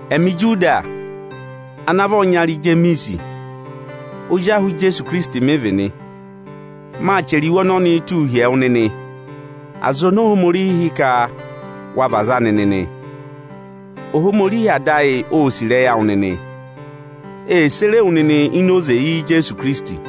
Ẹmị Ijudi ọyịnyara Ijemiisi ana vị ozi ahụ Ijeesu Ikirisiti. Maa chẹrẹ iwe ọnọnịị túu hi ẹwụ nịnị aza oni Ohomorihi hị́ ka wa vị aza anị nịnị. Ohomorihi Ada ayị ô sì ịrẹyị awụ nịnị, di ee sere wu nịnị ịnị oze Ijeesu Ikirisiti nị.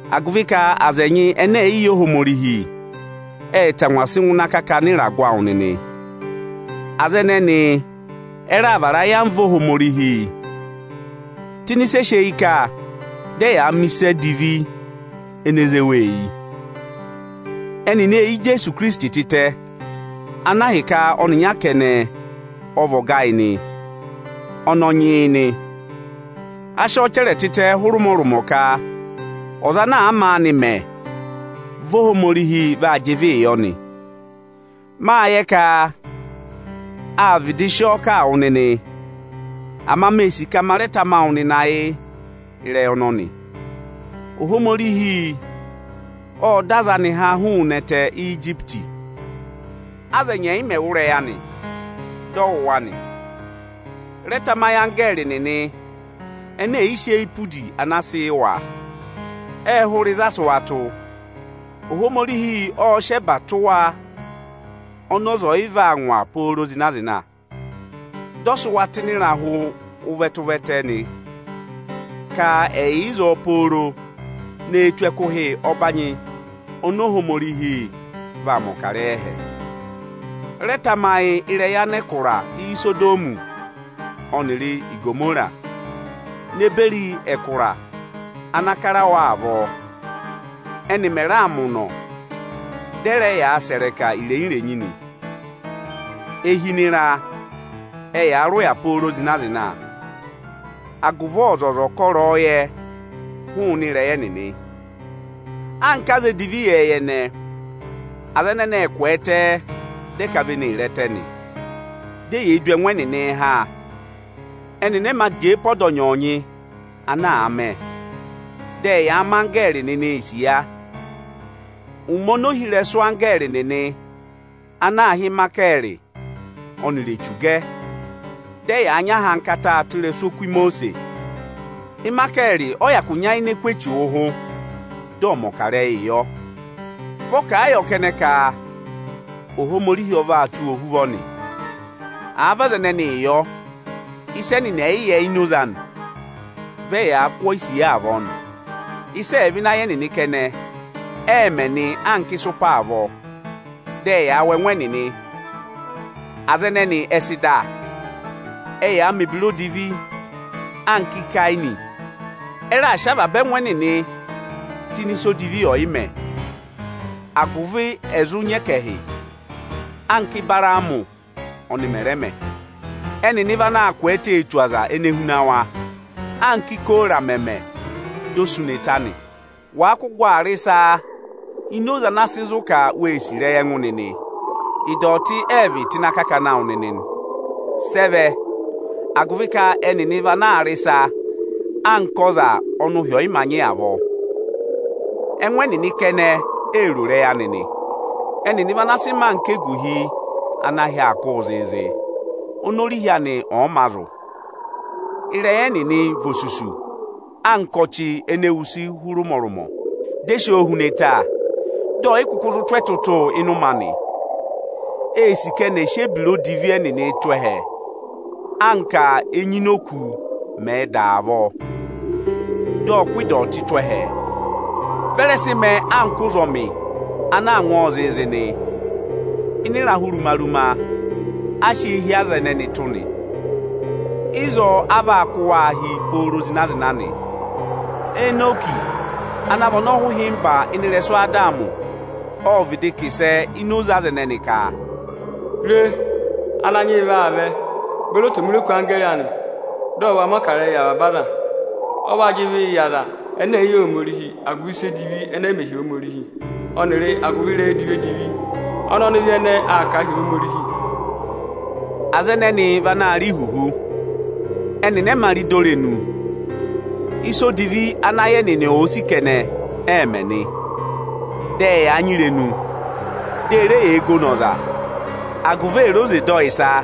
Agụvị ka aza ẹnyị ẹnẹ ẹ̀ yị yẹ Ohomorihi ệ tangwa sị ngụ ịnị akakana ịragụ awụ nịnị. Aza ẹnẹnị ẹ́ raà vara ayamva Ohomorihi tụ́ ịnị ịsị e sị eyi ka, dị ẹyaa mẹ ịsị e ze wa eyi nị. Ẹnịnị ê yi Ijeesu Ikirisiti tịtẹ, ana ahịka ọyịnyara ọ vị ọga ayị, dị ọ vị Ananyị yị nị. Á sị ọ chẹrẹ tịtẹ hụrị ụmọrụmọ ka ọza ana àa maanị mẹ, vị́ Ohomorihi vaa jị ịvịị yọ nị. Máa yẹ ka â vịdị sị ọ kà yị wụ nịnị, ama mee sì ka ma rẹ tama wụ nịnị ayị ịrẹyị ọnọnị: Ohomorihi ộ dọ aza anị ha hụụnị ẹtẹ Ijipiti. Aza ẹnyị ẹ̀ yị mẹ̀ wụ́ ịrẹyị anị, dị ọ wụ̀ wa nị. Rẹ tamayị anggẹẹrị nịnị ene è yi sị eyi pe udi ana a sị yị wa, ệ hụrẹ ịzị a sị wa tụ́. Ohomorihi ộ sị ẹba tụ́ wa ọnị ọza ọ̀ yị vaa ngwa pooro zịna-zịna, dị ọ sị wa tụ́ ịnị ịrahụ tụ ụvẹtẹ-ụvẹtẹ ka ẹ̀ yà ịzọọ pooro ne tù ẹkụhị ọbanyị ọnọọ oni Ohomorihi vaa mẹ̀ ọkarẹyị ẹhẹ nị. Rẹ tamayị ịrẹyị anẹkụra Isodọmị ọnịrị Igomora ne beri ẹkụra ana kara wa avọọ, ẹ́nị mẹ̀ raa mẹ ụnọ, dị ẹ rẹ yaa sẹ̀ ịrẹka irenyi-irenyi nị. E hi ịnị ịra, ẹyaa rị ụya pooro zịna-zịna, agụvị ọzọza ọ̀ kọ ịrẹyọyẹ hụụnị ịrẹyị ẹnịnị Anka aza edivi ịyẹẹyẹ ẹnẹẹ, aza ẹnẹnị ệ kwẹẹtẹ, dị ẹ ka vị́ ẹnị ee re ẹtẹ, di eyee du ẹngụ ẹnịnịị ha nị. Ẹnịnị ẹ́ yị ma jẹẹ pe ọda ọnyọọnyị ana àa mẹ, dị ẹyaa mẹ anggẹẹrị nịnị isiya. Ụmẹ oni ohirẹsụ anggẹẹrị nịnị ana aā hị́ Ịmayịkẹẹrị, ọnịrị Echu gẹ, dị ẹyaa nyị ahankata tụ́ ịrẹsụ oku Imosiisi, Ịmayịkẹẹrị ọ́ yị hyakụ nyayịnẹ kụ̀ Echu ụhụ, dị ọ mẹ̀ ọkarẹyị yọ. Vị́ ọ kà a yọ kẹnẹ ka: Ohomorihi ọ vaa tụ́ wụ ohuvọ nị. Àa vị aza ẹnẹnị yọ, ịsa ọnị ẹnịnị ẹ̀ yị yẹ ịnị oze anị e yee du avọọ nị. Ịsị ẹ̀ẹ vẹ ịnị ayị ẹnịnị kẹnẹ, ẹẹ̄ mẹ anka ịsụpa avọọ, dị ẹyaa wụ ẹngụ ẹnịnị nị. Aza ẹnẹnị ẹ sị da. Ẹyaa mẹ̀ ebira odivi anka Ikeeni. Ẹ raa sị avaba ẹngụ ẹnịnị tụ́ ịnị ịsa odivi ọyị mẹ, agụvị ẹ zụ nyị ẹkẹhị, anka Ịbaraamị ọnị mẹ̀ rẹ mẹ. Ẹnịnị vị anaā kwẹẹtẹ tu ọza ene huna wa, anka Ikora mẹ̀ mẹ, dị o sú ne ta. Wàa kụ gụ aa rị ịsa ịnị oze ana sị zụ ka wee sì ịrẹyị ẹngụ nịnị, ịdọtị ẹ vị tụ́ ịnị akakana awụ nịnị nị. Sị ẹ vẹ? Agụvị ka ẹnịnị vị anaā rị ịsa anka ọza ọnị ụhị ọ̀yị ma nyị avọọ. Ẹngụ ẹnịnị kẹnẹ ee ro ịrẹyị anị nị. Ẹnịnị vị ana sị mẹẹ anka eguhi ana ahị aa kụ́ụ zịịzị, oni orihi anị ọ̀ yị mā zụ̀. Ịrẹyị ẹnịnị vị osusu anka ọchị ene wusu hụrị ụmọrụmọ, di e si o hu ne ta, dị ọ̀ yị kụkụ zụ tụ́ ẹtụtụ ịnị ụmẹ anị. Eē si ka ẹnị ẹ̀ sị ebira odivi ẹnịnị tụ́ ẹhẹ anka enyi ini òkū mẹ̀ẹ̄ da, dị ọ kụ́ ịdọtị tụ́ ẹhẹ avọọ. Vị́ ẹ rẹ sị mẹẹ anka ụzọmị anaa ngwọọ zịịzị nị. Ịnị ịrahụ ruma-ruma a sị eehi aza ẹnẹnị tụ́ nị. Ịzọọ a vaa kụ́ wa hi pooro zịna-zịna nị. Enọkị ana vị ọnọhụhịmba ịnị ịrẹsụ Adamị ộ vịdị kà ịsẹ ịnị oze aza ẹnẹnị ka: Re, Ananyị yị vaa vẹ beri otomiroku anggẹẹrị ọnịnị anị, dị ọ va mẹ̀ ọkarẹyị yị avaba aza. Ọ vaa jị ịvịị yị aza ẹnẹ ẹ̀ yị yẹ Ohomorihi agụvị ịsa edivi ẹnẹ ẹ́ mẹ̀ hi Ohomorihi, ọnịrị agụvị ịrẹyị edivi-edivi ọnị ọnịvị ẹnẹẹ aa kà a hi Ohomorihi. Aza ẹnẹnị vị anaā rị ihuhu, ẹnịnị ẹ́ yị ma rị dọ irenu. Ịsa odivi ọnị ayị ẹnịnị èe sì kẹnẹ ẹẹ̄ mẹ nị, dị ẹyaa nyị irenu, dị e re yee gono ọza agụvị è re oze dọ ọ ịsa.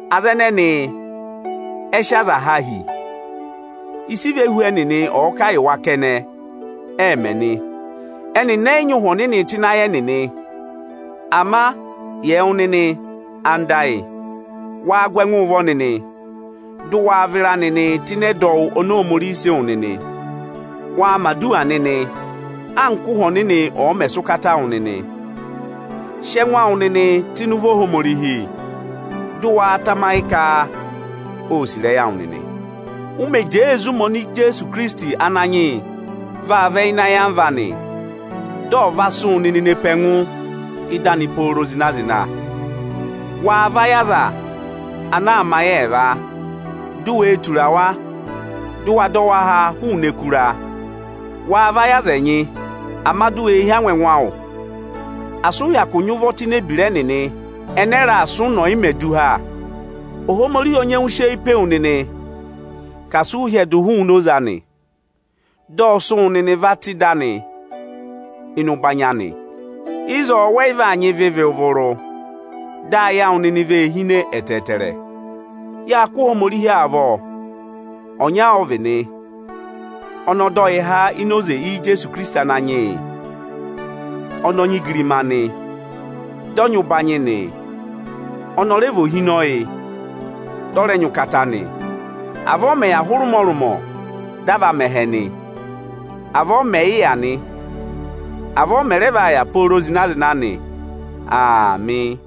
Aza ẹnẹnị ẹ sị aza há hi. Ịsị ivehu ẹnịnị ọ̀ọ kà yị wa kẹnẹ ẹẹ̄ mẹ nị, ẹnịnị ẹ́ yị nyị Ụhwẹ Ọnịnị tụ́ ịnị ayị ẹnịnị. Ama yị ẹwụ nịnị anda ayị, waa gụ ẹngụ ụvọ nịnị, di ụ waa vịra nịnị tụ́ ịnị ẹdọwụ oni Ohomorihi sị wụ nịnị. Waa mẹ̀ aduwa nịnị anka Ụhwẹ Ọnịnị ọ̀ọ mẹ sị ụkata yị wụ nịnị. Sị ẹngụ awụ nịnị tụ́ ịnị ụvọ Ohomorihi, dị ụ wa tamayị ka ô sì ịrẹyị awụ nịnị, ụ mẹ jẹẹ ee zí ụmẹ ọnị Ijeesu Ikirisiti Ananyị yị vaa vẹ ịnị ayamva anị, dị ọ̀ va sị wụ nịnị ne pe ẹngụ ị́dị anị pooro zịna-zịna. Waa vayị aza anaa mẹ ayị ẹẹva, di u wee tura wa, dị ụ wa dọ wa há hụụnị ẹkụra. Waa vayị aza ẹnyị, ama di u we hí angwa ẹngụ awụ; asị ụ hyakụ nyị ụvọ tụ́ ini ebira ẹnịnị ẹnẹ ẹ́ raa sị ụnọ ọ̀yị mẹ du há. Ohomorihi ọ nyẹngụ sị eyi pe wu nịnị ka asị ụ hyẹdụ hụụnị oze anị; dị ọ sị́ wụ nịnị va tụ ịdị anị ịnị ụbanyị anị, wẹ́ yị vaa nyị ịvị vụrụ-vụrụ ịzọọ nịnị, dị ayị awụ nịnị ee hine ẹtẹẹtẹrẹ. Yáa kụ́ Ohomorihi avọ; ọnya ọ́ vị nị. Ọnị ọ dọ yị há ini oze Ijeesu Ikirisiti Ananyị yị, ọnị ọ nyị igirima nị, dị ọ nyị ụbanyị nị, ọnị ọ rẹ vị ohinọyị nị, dị ọ rẹ nyị ụkata nị. Avọọ ọ mẹ̀ yị yà hụrẹ ụmọrụmọ dị a va mẹ ẹhẹ nị. Avọọ ọ mẹ yị yà nị. Avọọ ọ mẹ̀ rẹ vaa yà pooro zịna-zịna nị. Aamị.